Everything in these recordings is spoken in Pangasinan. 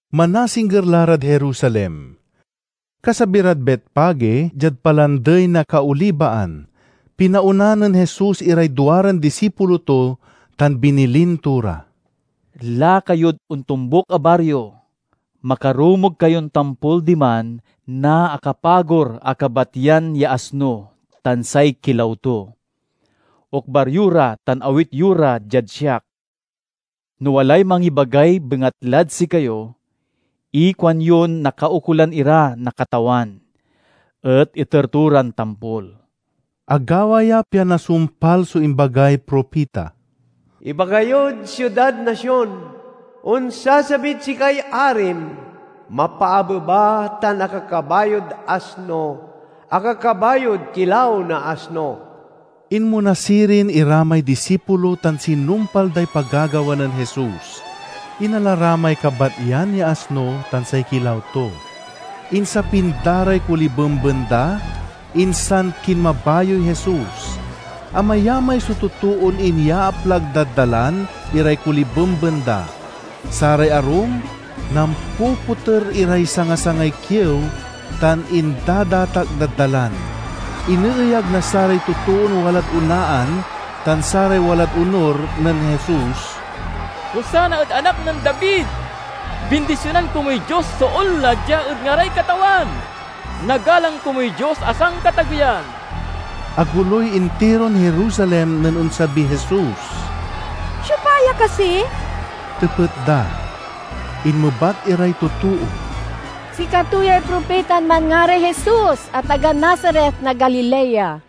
Manasingger la rad Jerusalem. Kasabi rad Betfage, diad Palandey na Kaolibaan, pinaona nen Jesus iray duaran disipulo to tan binilin to ra, "Laka yod ontombuk a bario. Makarumog kayon tampol diman na akapagor a kabatyan ya asno tan say kilaw to. Okbar yo ra tan awit yo ra diad siak. No walay mangibagay bangatlad sikayo, ikuanyon nakaukolan ira na Katawan, et iter to ran tampol." Agawa ya pian nasumpal so imbagay propita: "Ibaga yod siudad na Sion, Onsasabid sikay arim. Mapaabeba tan akakabayod asno, akakabayod kilaw na asno." Inmona sirin ira may disipulo tan sinumpal day pagagawa nen Jesus. Inala ra may kabatyan ya asno tan say kilaw to. Insapin da ray kolibemben da, insan kinmabayoy Jesus. Amayamay so totoon inyaaplag dad dalan iray kolibemben da. Saray arum nampopoter iray sangasangay kiew tan indadatak dad dalan. Ineeyag na saray totoon walad onaan tan saray walad onur nen Jesus, "Hosanna ed Anak nen David! Bindisionan komuy Dios so onla dia ed ngaray Katawan! Nagalang komuy Dios a Sankatageyan!" Agoloy intiron Jerusalem nen onsabiy Jesus. "Siopa ya kasi?" tepet da. Inmebat iray totoo, "Sikato yay propitan manngaray Jesus a taga Nazaret na Galilea."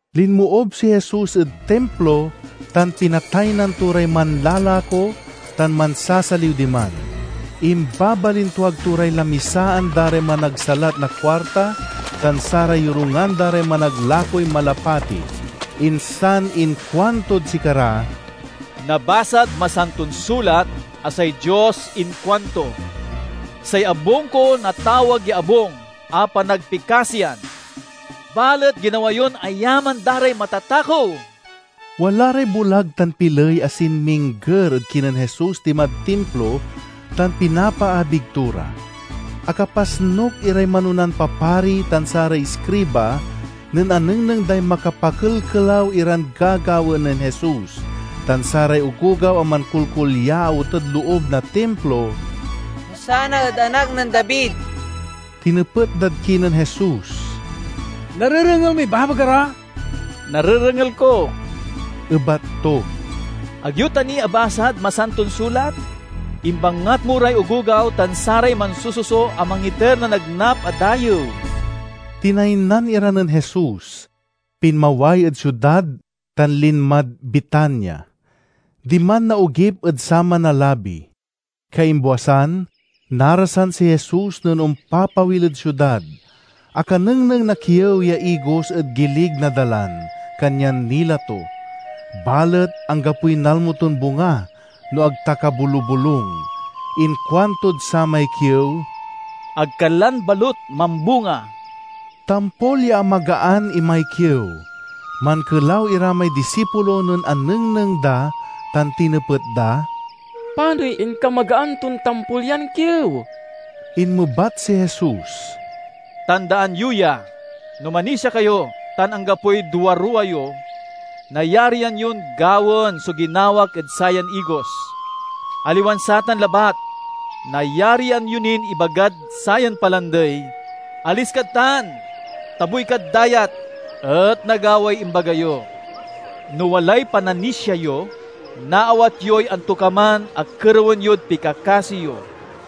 Linmoob si Jesus ed Timplo tan pinataynan to ray manlalako tan mansasaliw diman. Imbabalintuag to ray lamisaan da ray managsalat na kuarta tan saray yorungan da ray managlakoy malapati. Insan inkuantod sikara, "Nabasad Masanton Sulat a say Dios inkuanto: 'Say abung ko natawag ya abung a panagpikasiyan.' Balet ginawa yon ayaman da ray matatakew!" Wala ray bulag tan piley a sinmingger ed kinen Jesus dimad Timplo tan pinapaabig to ra. Akapasnuk iray manonan papari tan saray iskriba nen anengneng day makapakelkelaw iran gagawaen nen Jesus tan saray ogogaw a mankulkulyaot ed loob na Timplo, "Hosanna ed Anak nen David!" Tinepet dad kinen Jesus, "Narerengel moy ibabaga ra?" "Narerengel ko," ebat to. "Ag yo ta ni abasad Masanton Sulat? 'Imbangat mo ray ogogaw tan saray mansususo a mangiter na nagnap a dayew.'" Tinaynan ira nen Jesus, pinmaway ed siudad tan linmad Betania. Diman naogip ed saman a labi. Kaimbwasan, narasan si Jesus nen ompapawil ed siudad. Akanengneng na kiew ya igos ed gilig na dalan, kanyan nila to. Balet anggapoy nalmo ton bunga, no ag ta kabolubolung. Inkuantod samay kiew, "Ag ka lan balut mambunga!" Tampol ya amagaan imay kiew. Mankelaw ira may disipulo nen anengneng da tan tinepet da, "Panoy inkamagaan ton tampol yan kiew?" Inmebat si Jesus, "Tandaan yo ya! No manisia kayo tan anggapoy duaruwa yo, nayarian yon gawaen so ginawak ed sayan igos. Aliwan satan labat, nayarian yo nin ibagad sayan palandey, 'Alis kad tan, tabuy kad dayat,' et nagaway imbaga yo. No walay pananisia yo, naawat yoy antokaman a kerewen yod pikakasi yo."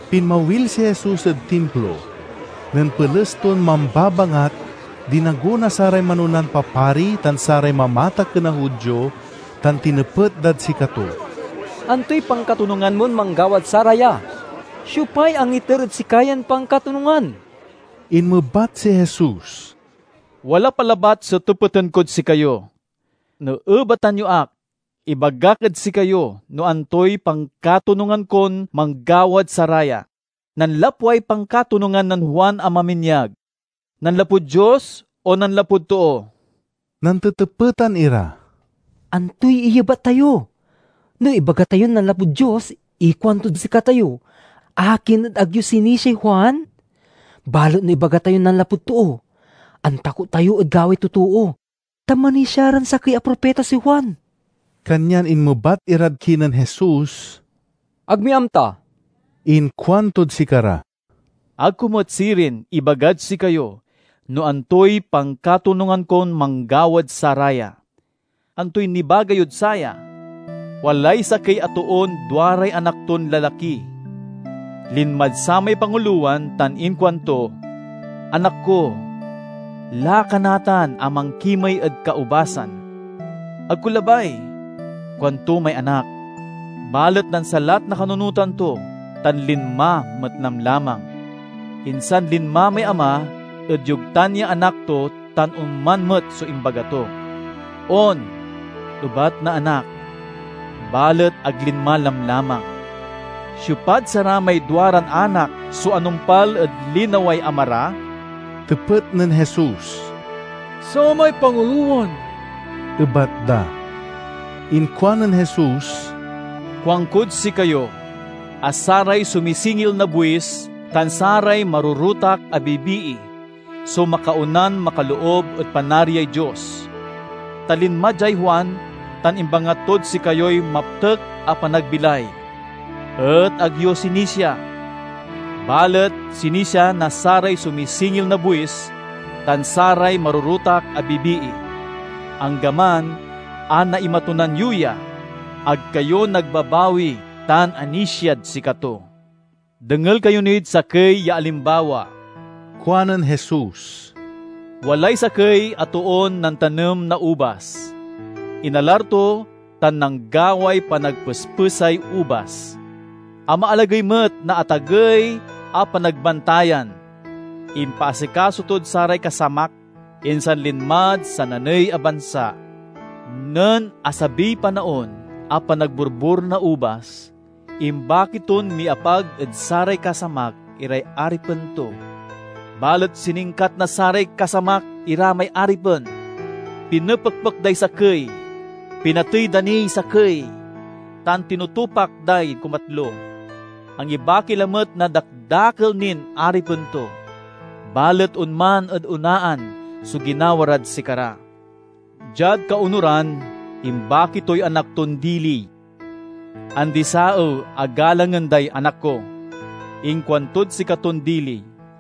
Pinmawil si Jesus ed Timplo. Nen peles ton mambabangat, dinago na saray manonan papari tan saray mamatakken a Judio tan tinepet dad sikato, "Antoy pankatonungan mon manggawad saraya? Siopay angiter ed sika yan pankatonungan?" Inmebat si Jesus, "Wala pa labat so tepeten kod sikayo. No ebatan yo ak, ibagak ed sikayo no antoy pankatonungan kon manggawad saraya. Nanlapway pankatonungan nen Juan a maminyag, nanlapud Dios o nanlapud too?" Nantetepetan ira, "Antoy iyebat tayo? No ibaga tayon nanlapud Dios, ikuantod sikatayo, 'Akin et ag yo sinisiay Juan?' Balet no ibaga tayon nanlapud too, antakot tayo ed gawaey totoo, ta manisia ran sakey a propita si Juan." Kanyan inmebat irad kinen Jesus, "Ag mi amta." Inkuantod sikara, "Ag ko met sirin ibagad sikayo no antoy pankatonungan kon manggawad saraya." "Antoy nibaga yod saya? Walay sakey a toon duaray anak ton lalaki. Linmad samay pangulowan tan inkuanto, 'Anak ko, laka natan a mankimey ed kaubasan.' 'Ag ko labay,' kuanto may anak. Balet nansalat na kanunotan to tan linma met lamlamang. Insan linma may ama ed yogtan ya anak to tan onman met so imbaga to. 'On,' ebat na anak, balet ag linma lamlamang. Siopad saramay duaran anak so anumpal ed linaway ama ra?" tepet nen Jesus. "Samay pangulowan," ebat da. Inkuanen Jesus, "Kuankod sikayo a saray sumisingil na buis tan saray marorotak a bibii so makaonan makaloob ed Panariay Dios. Ta linma diay Juan tan imbangat tod sikayoy maptek a panagbilay, et ag yo sinisia. Balet sinisia na saray sumisingil na buis tan saray marorotak a bibii. Anggaman a naimatunan yo ya, ag kayo nagbabawi tan anisiad sikato." "Dengel kayo nid sakey ya alimbawa," kuanen Jesus. "Walay sakey a toon nantanem na ubas. Inalar to tan nanggaway panagpespesay ubas. Amaalagey met na atagey a panagbantayan. Impaasikaso tod saray kasamak, insan linmad sananey a bansa. Nen asabiy panaon a panagborbor na ubas, imbaki ton miapag ed saray kasamak iray aripen to. Balet siningkat na saray kasamak ira may aripen. Pinepekpek day sakey, pinatey da niy sakey, tan tinutupak day kumatlo. Angibaki lamet na dakdakel nin aripen to, balet onman ed onaan so ginawa rad sikara. Diad kaonuran, imbaki toy anak ton dili, 'Andi-saew a galangen day anak ko,' inkuantod sikaton dili.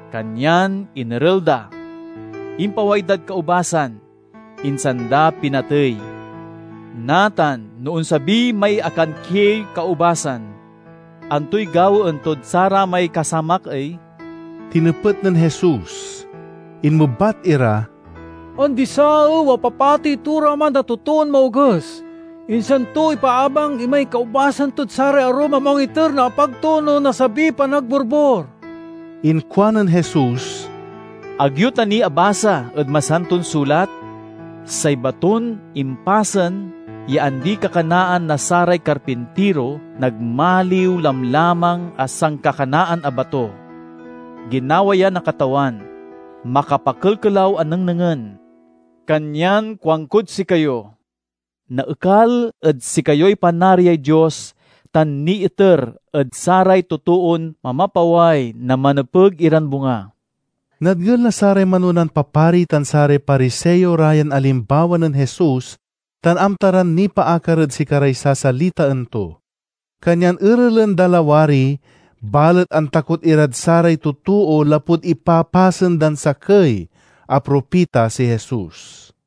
Kanyan inerel da, impaway dad kaubasan, insan da pinatey. "Natan, no onsabi may akankiey kaubasan, antoy gawaen tod saramay kasamak ey?" tinepet nen Jesus. Inmebat ira, "Andi-saew a papatey to ra man a totoon maoges, insan to ipaabang imay kaubasan tod saray arum a mangiter na apag to no nasabiy panagborbor." Inkuanen Jesus, "Ag yo ta ni abasa ed Masanton Sulat? 'Say baton impasen ya andi-kakanaan na saray karpintiro nagmaliw lamlamang a sankakanaan a bato. Ginawa ya na Katawan; makapakelkelaw a nengnengen!' "Kanyan kuankod sikayo: naekal ed sikayoy Panariay Dios tan niiter ed saray totoon mamapaway na manepeg iran bunga." Nadngel na saray manonan papari tan saray Pariseo ra yan alimbawa nen Jesus tan amta ran nipaakar ed sikaray sasalitaen to. Kanyan erelan da lawari, balet antakot irad saray totoo lapud ipapasen dan sakey a propita si Jesus.